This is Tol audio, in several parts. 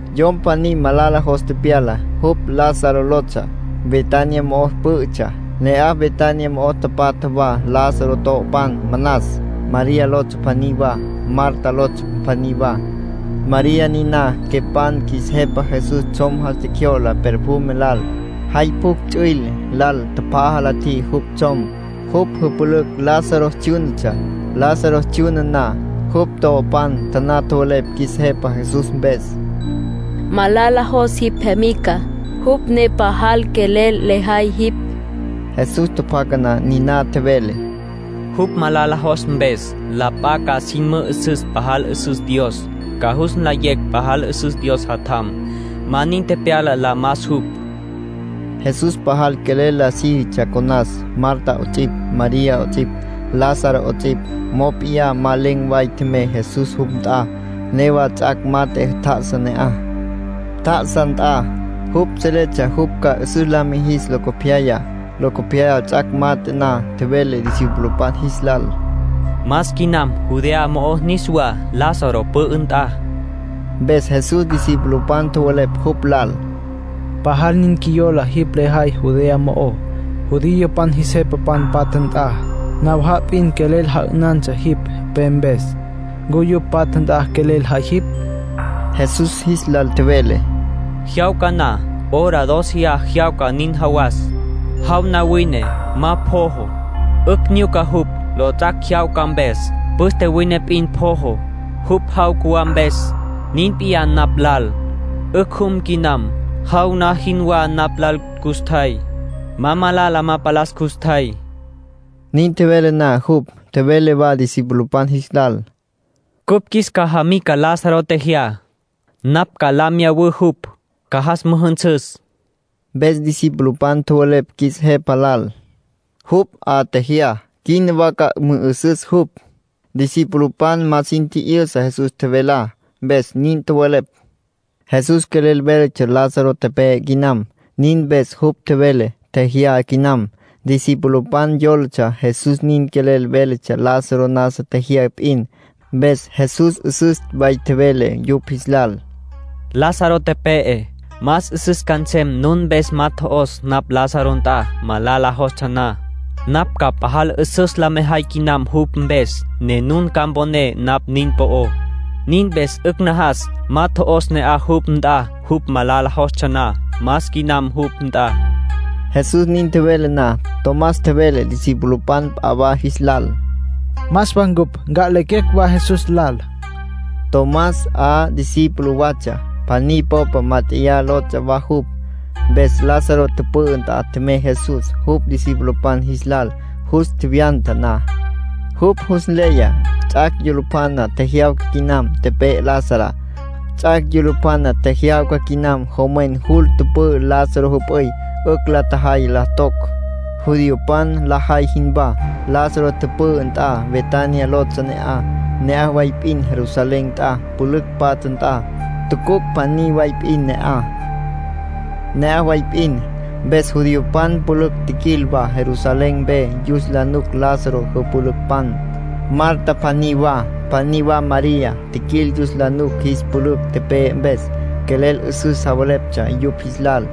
Yom pjaní malala jos tepyala. Jupj Lázaro lotsja. Betania mo'o pǘ'ütsja. Ne'aj Betania mo'o tapatja wa Lázaro to'opan manas. María lotsja pjaní wa, Marta lotsja pjaní wa. (María niná quepan qjuis Jepa Jesús tsjom jas tjecjyo'la perfume lal. Jay pjucj ts'üil lal tjapjaja la tjiji jupj tsjom. Jupj jüpülücj Lázaro tsjyúnatsja.) Lázaro tsjyuna na, jupj to'opan taná tjowelepj qjuis Jepa Jesús mpes: “Malala jos jipj jemica, jupj ne pajal quelel lejay jipj”. Jesús tjapjaca na niná, tjevele: “Jupj malala jos mpes, la p'a ca sin mü'üsüs pajal 'üsüs Dios. Ca jus nlayecj pajal 'üsüs Dios Jatjam. Ma nin tepyala la mas jupj”, nin tjevele Jesús. Jesús pajal quelel la síjitsja conas, Marta 'ots'ipj, María 'ots'ipj, Lázaro 'ots'ipj. Mop'iyá ma len̈ way tjemey Jesús jupj nt'a. Newa ts'ac' mat'e tjá'asa ne'aj, tjá'asa nt'a. Jupj seletsja jupj ca 'üsüs la mijis locopyaya. Locopyaya ts'ac' mat'e na, tjevele discipulopan jis lal: —Mas quinam Judea mo'ó niswá, Lázaro pü'ü nt'a. Mpes Jesús discipulopan tjowelepj jupj lal: —Pajal nin qjuiyola jipj jay Judea mo'ó, judiopan jis jepapan patja nt'a. Nawaja'a p'in quelel ja'ünantsja jipj pe mpes. ¿Ncu yupj patja nt'a quelel jay jipj? Jesús jis lal tjevele: —Jyawca na, hora dóceya jyawca nin jawas. Jaw na wine, ma pojo. 'Ücj nyuca jupj, lots'ac' jyawca mpes. Püste wine p'in pojo, jupj jaw cjuwá mpes. Nin p'iyá napj lal. 'Ücj jum quinam. Jaw na jinwá napj lal custjay. Ma malala ma palas custjay. Nin tjevele na jupj, tjevele wa discipulopan jis lal: —Cupj qjuis cajamica Lázaro tjejyá. Napj ca lya miyawǘ jupj, ca jas müjünsüs. Mpes discipulopan tjowelepj qjuis Jepa lal: —Jupj 'a tjejyá, quina wa ca mü'ü'süs jupj. Discipulopan ma sin tji'yüsa Jesús tjevelá, mpes nin tjowelepj. Jesús quelel véletsja Lázaro tepe'e quinam. Nin mpes jupj tjevele “tjejyá” quinam. Discipulopan yólatsja Jesús nin quelel véletsja Lázaro nasa tjejyá p'in. Mpes Jesús 'üsüs way tjevele yupj jis lal: —Lázaro tepe'e. Más 'üsüs ca nsem nun mpes ma tjo'os napj Lázaro nt'a, malala jostsja na. Napj ca pajal 'üsüs la mejay quinam jupj mpes, ne nun ca mponé napj nin po'ó. Nin mpes 'ücj najas ma tjo'os ne'aj jupj nt'a jupj malala jostsja na. Mas quinam jupj nt'a. Jesús nin tjevele na, Tomás tjevele discipulopan p'a wa jis lal: —Mas wa ncupj, nca'lequecj wa Jesús lal. (Tomás 'a discípulo watsja. ‘Pjaní Popa Mát'eya’ lotsja wa jupj.) Mpes Lázaro tüpü'ü nt'a tjemey Jesús, jupj discipulopan jis lal. Jus tjevyanta na, jupj jus nleya ts'ac' yulupjana tjejyawca quinam tepe'e Lazará. Ts'ac' yulupjana tjejyawca quinam jomwen jul tüpü'ü Lázaro jüp'üy. 'Ücj la tjajay la toc, judiopan lajay jinwá. Lázaro tüpü'ü nt'a Betania lotsja ne'aj. Ne'aj way p'in Jerusalén nt'a, pülücj patja nt'a. Tucuc' pjaní way p'in ne'aj. Ne'aj way p'in, mpes judiopan pülücj tjiquil wa Jerusalén mpe yus la nuc Lázaro jüpülücpan, Marta pjaní wa, pjaní wa María. Tjiquil yus la nuc jis pülücj tepe'e mpes. Quelel 'üsüs javeleptsja yupj jis lal,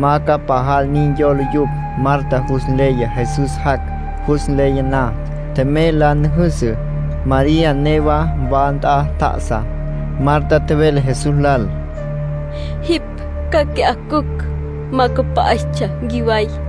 ma ca pajal nin yola yupj. Marta jus nleya Jesús jac'. Jus nleya na, tjemey la nüjüsü. María newa wa nt'a tjá'asa. Marta tjevele Jesús lal: —Jipj qui'á cücj, ma cüpa'istsja nquiway.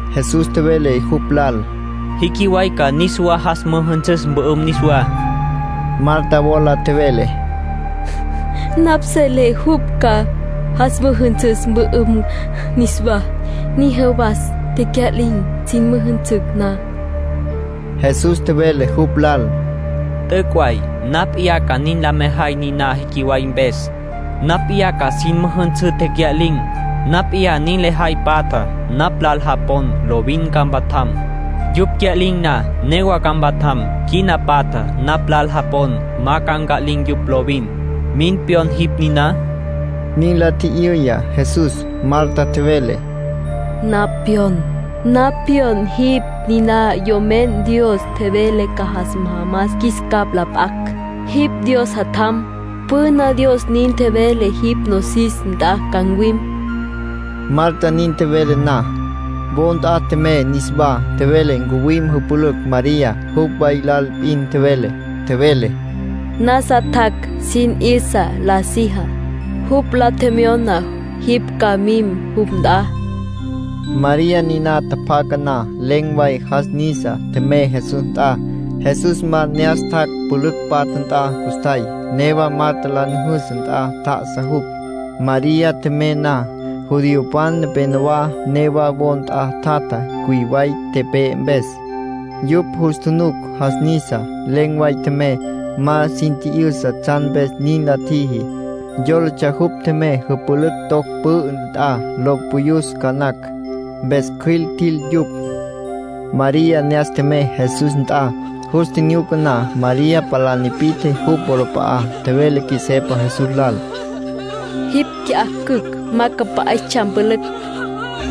Jesús tjevele jupj lal: —Jiquiway ca niswa jas müjünsüs mpü'üm niswá. Marta wola tjevele: —Napj selé jupj ca jas müjünsüs mpü'üm niswá, nin jawas tecya'lin̈ sin müjünsücj na. Jesús tjevele jupj lal: —T'üc'. Napj p'iyá ca nin la mejay niná jiquiway mpes. Napj p'iyá ca sin müjünsǘ tecya'lin̈. Napj p'iyá nin lejay patjá. Napj lal japon, lovin ca mpatjam. Yupj cya'lin̈ na, newa ca mpatjam. Quina patja, napj lal japon, ma ca nca'lin̈ yupj lovin. ¿Min pyon jipj niná? —nin la tji'yüya Jesús. Marta tjevele: —Napj pyon. Napj pyon jipj niná Yomen Dios tjevele ca jas majamas qjuis capj la p'acj. Jipj Dios Jatjam. Püna Dios nin tjevele jipj nosis nt'a ca ncuwim. Marta nin tjevele na, wo nt'a tjemey niswá. Tjevele ncuwim jüpülücj María. Jupj way lal p'in tjevele. Tjevele: —Nasa tjac' sin 'yüsa la sijá. Jupj la tjemyona jipj ca mim jupj nt'a. María niná tjapjaca na, len̈ way jas nisa, tjemey Jesús nt'a. Jesús ma ne'as tjac' pülücj patja nt'a custjay. Newa Marta la nüjüsü nt'a tjá'asa jupj. María tjemey na, judiopan nepenowá newa wo nt'a tjatja cüiway tepe'e mpes. Yupj jus tjunuc jas nisa, len̈ way tjemey. Ma sin tji'yüsa tsjan mpes nin la tjiji. Yólatsja jupj tjemey jüpülücj toc pü'ü nt'a lo puyus ca nacj. Mpes cjüil tjil yupj. María ne'as tjemey Jesús nt'a. Jus tjinyuca na, María palá nipi'tje jupj wolap'a'á. Tjevele Qjuis Jepa Jesús lal: —Jipj qui'á cücj, ma cüpa'istsja mpülücj.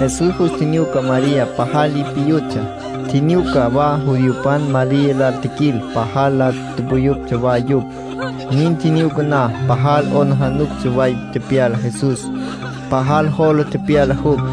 Jesús jus tjinyuca María pajal li piyutsja. Tjinyuca wa judiopan María lal tjiquil pajal la puyuptsja wa yupj. Nin tjinyuca na, pajal 'aplijila way tepyala Jesús. Pajal jola tepyala jupj.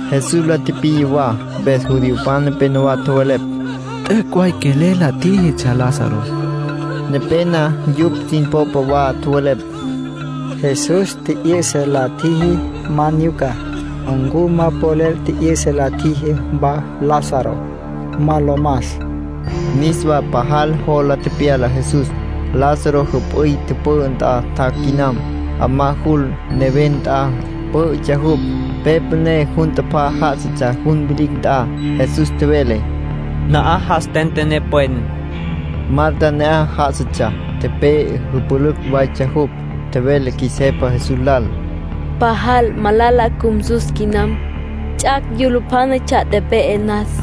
Jesús la tipiya wa. Mpes judiopan nepénowa tjowelepj: —T'üc' way quelel la tjíjitsja Lázaro. Nepena yupj sin popa wa tjowelepj: —Jesús tji'yü'sa la tjiji ma nyucá. ¿Ncu ma polel tji'yü'sa la tjiji wa Lázaro, ma lo mas? Niswa pajal jola tepyala Jesús. Lázaro jüp'üy tüpü'ü nt'a tjac' quinam. 'Amá jul, neven nt'a, pǘ'ütsja jupj. Pe püné jun tapá já'asatsja jun vilicj nt'a. Jesús tjevele: —Na'aj jas tentené pwen. Marta ne'aj já'asatsja. Tepe'e jüpülücj waytsja jupj. Tjevele Qjuis Jepa Jesús lal: —Pajal malala cjumsu quinam. Ts'ac' yulupjánatsja tepe'e nas.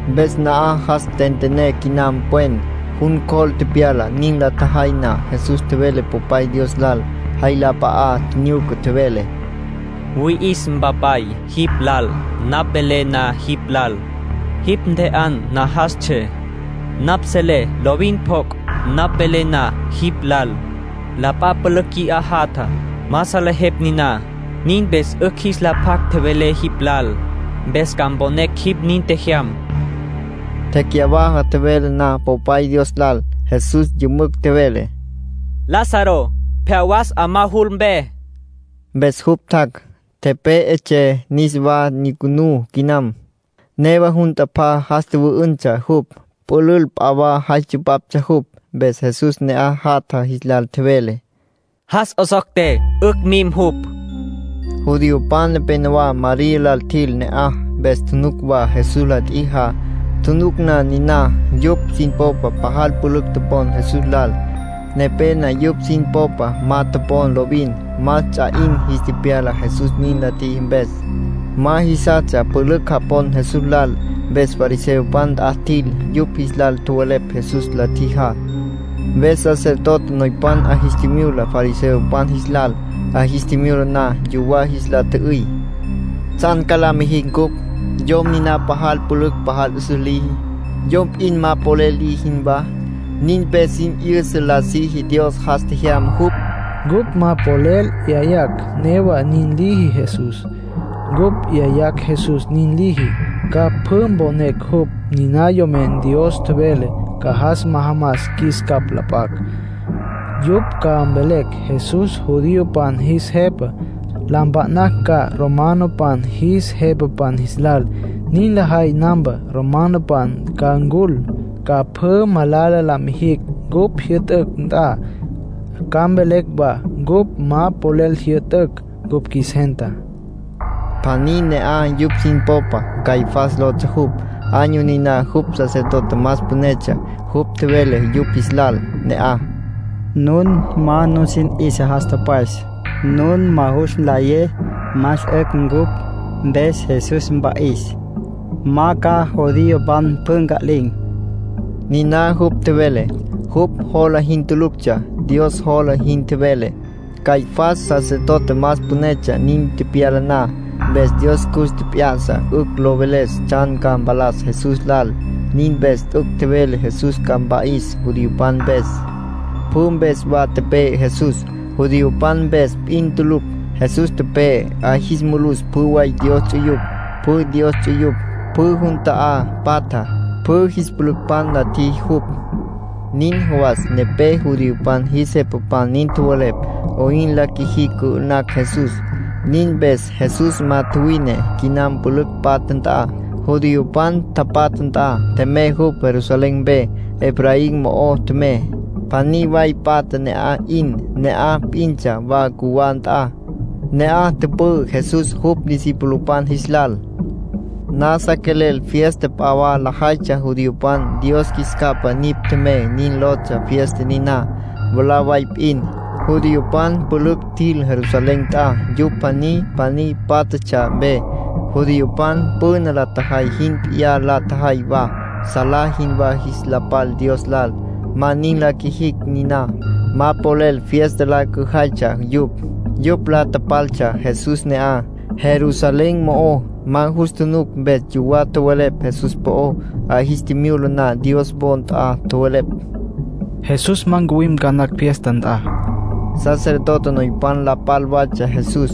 Mpes na'aj jas tentené quinam pwen, jun cjol tepyala. Nin la tjajay na, Jesús tjevele Popay Dios lal. Jay la p'a'a tjinyuca, tjevele: —Wüi'is, Mpapay, jipj lal. Napj tjevelé na jipj lal, jipj ntje'an najastsjé. Napj selé lovin pjoc' napj velé na jipj lal. La p'a pülücj qui'á jatja, ma salejepj niná. Nin mpes 'ücj jis la pjac tjevelé jipj lal. Mpes ca mponecj jipj nin tjejyam —nin tjevele Jesús. Tecyawaja tjevele na Popay Dios lal, Jesús yümücj tjevele: —Lázaro, pje'á was 'amá jul mpe. Mpes jupj tjac', tepe'etsjé. Niswa nyucunú quinam. Newa jun tapá jas tjüvü'üntsja jupj. Pülül p'a wa jay tsupaptsja jupj. Mpes Jesús ne'aj jatja jis lal tjevele: —Jas 'osocté, 'ücj mim jupj. Judiopan nepenowá María lal tjil ne'aj, mpes tjunuc wa Jesús la tjijá. Tjunuc na niná, yupj sin popa pajal pülücj topon Jesús lal. Nepena yupj sin popa ma topon lovin. Más ts'a 'in jis tepyala Jesús nin la tjiji mpes. Ma jisastsja pülücj japon Jesús lal. Mpes fariseopan nt'a tjil, yupj jis lal tjowelepj Jesús la tjijá. Mpes sacerdote noypan 'a jis tjimyula fariseopan jis lal. 'A jis tjimyula na, yuwá jis la tjü'üy: —¿Tsjan ca la mijicj cupj? Yom niná pajal la pülücj pajal 'üsüs liji, yom p'in ma polel liji jinwá. Nin mpes sin 'yüsa la siji Dios jas tjejyama jupj. Cupj ma polel 'yayacj newa nin liji Jesús. Cupj 'yayacj Jesús nin liji, ca pjü mponecj jupj niná Yomen Dios tjevele ca jas majamas qjuis capj la p'acj. Yupj ca mvelecj Jesús judiopan jis Jepa. La mpa'nacj ca romanopan jis jepapan jis lal. Nin lajay nampa, romanopan ca ncul, ca pjü malala la mijicj cupj jyü'tücj nt'a. Ca mvelecj wa cupj ma polel jyü'tücj cupj qjuis gentá —nin tjowelepj yupj. Pjaní ne'aj yupj sin popa, Caifás lotsja jupj. Año niná jupj sacerdote más pünetsja. Jupj tjevele yupj jis lal ne'aj: —Nun ma nusin 'yüsa jas tüpwes. Nun ma jus nlayé más 'ücj cupj mpes Jesús mpa'is, ma ca judiopan pjü nca'lin̈. Niná jupj tjevele, jupj jola jin tuluctsja. Dios jola jin tjevele. Caifás sacerdote más pünetsja nin tepyala na, mpes Dios cus tjep'ya'sa 'ücj lo veles tsjan ca mpalas Jesús lal. Nin mpes t'üc' tjevele Jesús ca mpa'is judiopan mpes. Pjü mpes wa tepe'e Jesús, judiopan mpes p'in tulucj. Jesús tepe'e, 'a jis mulus pjü way Dios ts'uyupj. Pjü Dios ts'uyupj, pjü jun ta'á patja, pjü jis pülücpan la tjiji jupj. Nin jawas nepé judiopan jis jepapan nin tjowelepj 'oyn la qjuijicj cü'ü'nacj Jesús. Nin mpes Jesús ma tjuwine quinam pülücj patja nt'a, judiopan tapatja nt'a. Tjemey jupj Jerusalén mpe. Efraín mo'o tjemey. Pjaní way patja ne'aj 'in. Ne'aj p'intsja wa cjuwá nt'a. Ne'aj tüpü'ü Jesús jupj discipulopan jis lal. Nasa quelel fiesta p'a wa lajaytsja judiopan. “Dios Qjuis Capa Nipj Tjemey” nin lotsja fiesta niná. Mwalá way p'in, judiopan pülücj tjil Jerusalén nt'a yupj pjaní pjaní pátjatsja mpe. Judiopan püna la tjajay jin p'iyá la tjajay wa, salá jinwá jis la pal Dios lal. Ma nin la qjuijicj niná, ma polel fiesta la cüjaytsja yupj. Yupj la tapaltsja Jesús ne'aj, Jerusalén mo'ó. Ma jus tjunuc, mpes yuwá tjowelepj Jesús po'ó, 'a jis tjimyula na Dios wo nt'a. Tjowelepj: “Jesús ma ncuwim ca nacj fiesta nt'a”. Sacerdote noypan la pal watsja Jesús.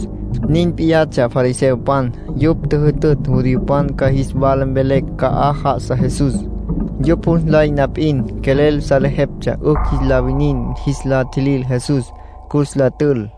Nin p'iyatsja fariseopan. Yupj tjüjütütj judiopan ca jis wala mvelecj ca'aj já'asa Jesús, yupj jus nlay na p'in. Quelel salejeptsja 'ücj jis la winin jis la tjilil Jesús, cus la tül.